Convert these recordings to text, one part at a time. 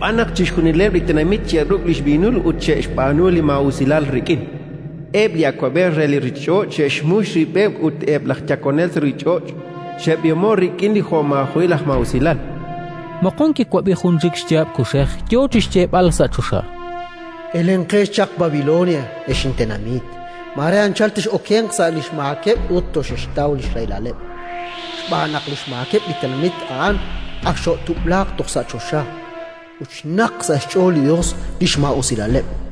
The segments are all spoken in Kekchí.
Xb'aan naq chixjunileb' li tenamit xe'ruk' li xb'iinul ut xe'xb'aanu li maa'usilal rik'in; eb' li awab'ej re li ruuchich'och' xe'xmux rib'eb', ut eb' laj yakonel sa' ruuchich'och' xe'b'ihomo'k rik'in li xjo'maajo'il aj maa'usilal”. Moqon kiwab'i jun chik xyaab' kuxej yo chi xyeeb'al sa' choxa: “Elenqex chaq Babilonia, ex intenamit: mare anchal tex'okenq sa' li xmaakeb' ut toxexxtaw li xrahilaleb'. Xb'aan naq li xmaakeb' li tenamit a'an ak xo'tub'laaq toj sa' choxa, ut xnaqk sa' xch'ool li Yos li xmaa'usilaleb'.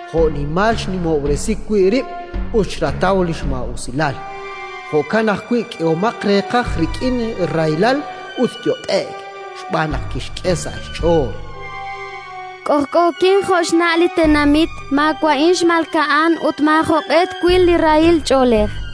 Jo'nimal xnimob'resi wi' rib' ut xrataw li maa'usilal, jo'kan ajwi' k'ehomaq reeqaj rik'in rahilal ut yot'e'k. Xb'aan naq kixye sa' xch'ool: «K'ojk'ookin jo' xna' li tenamit, maawa'in xmalka'an ut maajoq'e twil li rahil ch'oolej», chan.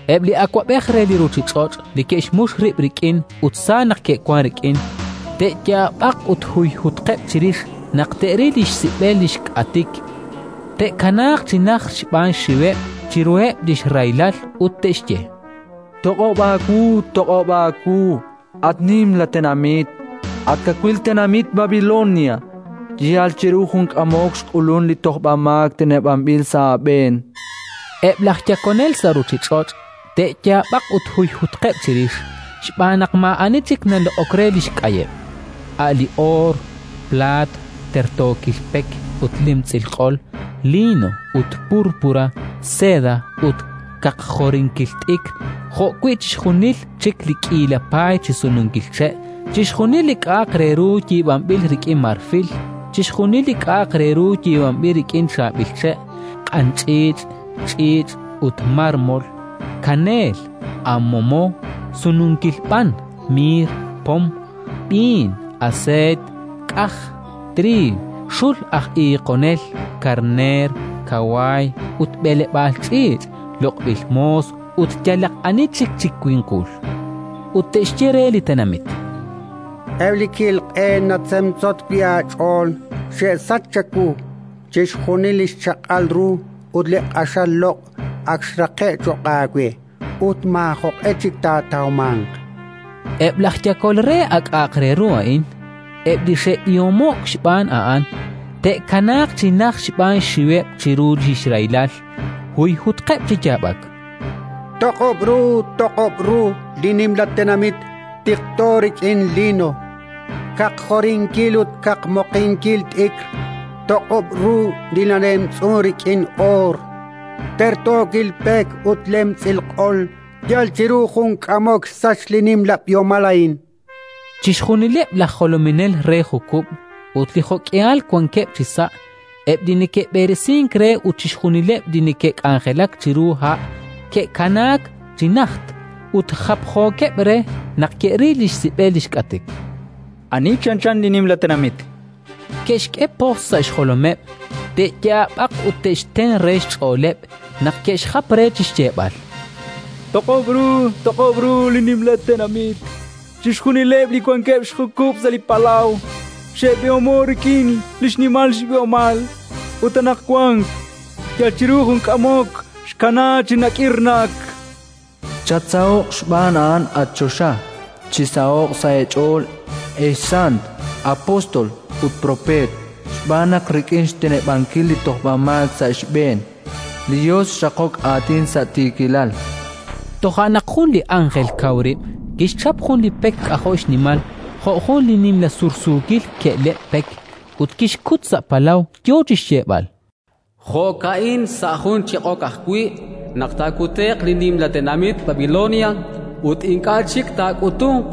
Eb' li awab'ej re li ruuchich'och' li ke'xmux rib' rik'in ut sa naq ke'wank rik'in, te'yaab'aq ut huyhutqeb' chirix, naq te'ril li xsib'el li xk'atik; te'kanaaq chi najt xb'aan xxiweb' chiruheb' li xrahilal ut te'xye: “Toq'ob' aawu, toq'ob' aawu, at Nimla Tenamit, at kawil tenamit Babilonia! Yal chiru jun k'amok xk'ulunk li tojb'amaak teneb'anb'il sa' aab'een!”. Eb' laj yakonel sa' ruuchich'och' te'yaab'aq ut huyhutqeb' chirix, xb'aan naq maa'ani chik naloq'ok li xk'ayeb': a' li oor, plaat, tertookil pek ut lemtz'il q'ol, liino ut púrpura, seda ut kaqjorinkil t'ikr, jo'wi' chixjunil chik li k'iila paay chi sununkil che', chixjunil li k'a'aq re ru yiib'anb'il rik'in marfil, chixjunil li k'a'aq re ru yiib'anb'il rik'in chaab'il che', q'anch'iich', ch'iich' ut mármol; kaneel, amomo, sununkil b'an, miir, pom, b'iin, aseeyt, k'aj, triiw, xul aj iiqonel, karneer, kawaay ut b'eleb'aal ch'iich'; loq'b'il moos ut yalaq ani chik chi winqul. Ut te'xye re li tenamit: “Eb' li ki'il q'een natzemtzot wi' aach'ool xe'sachk chawu; chixjunil li xchaq'al ru ut li q'axal loq' ak xraqe'k cho'q aawe ut maajoq'e chik taatawmanq”. Eb' laj yakol re a k'a'aq re ru a'in, eb' li xe'b'ihomo'k xb'aan a'an, te'kanaaq chi najt xb'aan xxiweb' chiru li xrahilal, huyhutqeb' chi yaab'ak: “Toq'ob' ru, toq'ob' ru li Nimla Tenamit, tiqto rik'in liino, kaqjorinkil ut kaqmoqinkil t'ikr! Toq'ob' ru li nalemtz'unk rik'in oor, tertookil pek ut lemtz'il q'ol! Yal chiru jun k'amok xsachk li nimla b'ihomal a'in!”, cha'qeb'. Chixjunileb' laj jolominel re jukub' ut li jo'k'ihal wankeb' chisa', eb' li neke'b'eresink re ut chixjunileb' li neke'k'anjelak chiru ha' ke'kanaak chi najt ut japjookeb' re naq ke'ril li xsib'el li xk'atik: “Ani chanchan li Nimla Tenamit?”, chankeb'. Ke'xk'e pojtz' sa' xjolomeb', te'yaab'aq ut te'xten re xch'ooleb' naq ke'xjap re chi xyeeb'al: “Toq'ob' ru, toq'ob' ru li Nimla Tenamit! Chixjunileb' li wankeb' xjukub' sa' li palaw xe'b'ihomo'k rik'in li xnimal b'ihomal, ut anaqwan, yal chiru jun k'amok, xkanaak chi nakirnak!”. Chatsaho'q xb'aan a'an, at choxa. Chisaho'q sa' eech'ool, ex sant, apóstol ut propeet, xb'aan naq rik'in xteneb'ankil li tojb'amaak sa' xb'een, li Yos xraqok aatin sa' tiikilal. Toja' naq jun li ánjel kaw rib' kixchap jun li pek k'ajo' xnimal, jo' jun nimla sursuukil ke'leb' pek, ut kixkut sa' palaw, yo chi xyeeb'al: “Jo'ka'in, sa' jun chiq'ok ajwi' naq taakute'q li nimla tenamit Babilonia, ut ink'a' chik taak'utunq.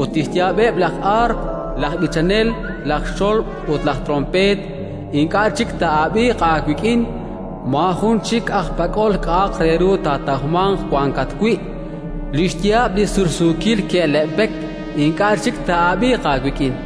Ut li xyaab'eb' laj aarp, laj b'ichanel, laj xolb' ut laj tronpeet ink'a' chik taa'ab'iiq aawik'in; maajun chik aj pak'ol k'a'aq re ru taatawmanq wankat wi'; li xyaab' li sursuukil ke'leb' pek ink'a' chik taa'ab'iiq aawik'in.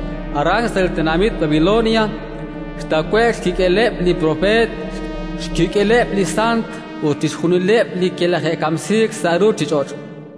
Aran, sa' li tenamit Babilonia, xtawe'k xkik'eleb' li propeet, xkik'eleb' li sant ut chixjunileb' li kilaje'kamsiik sa' ruuchich'och'.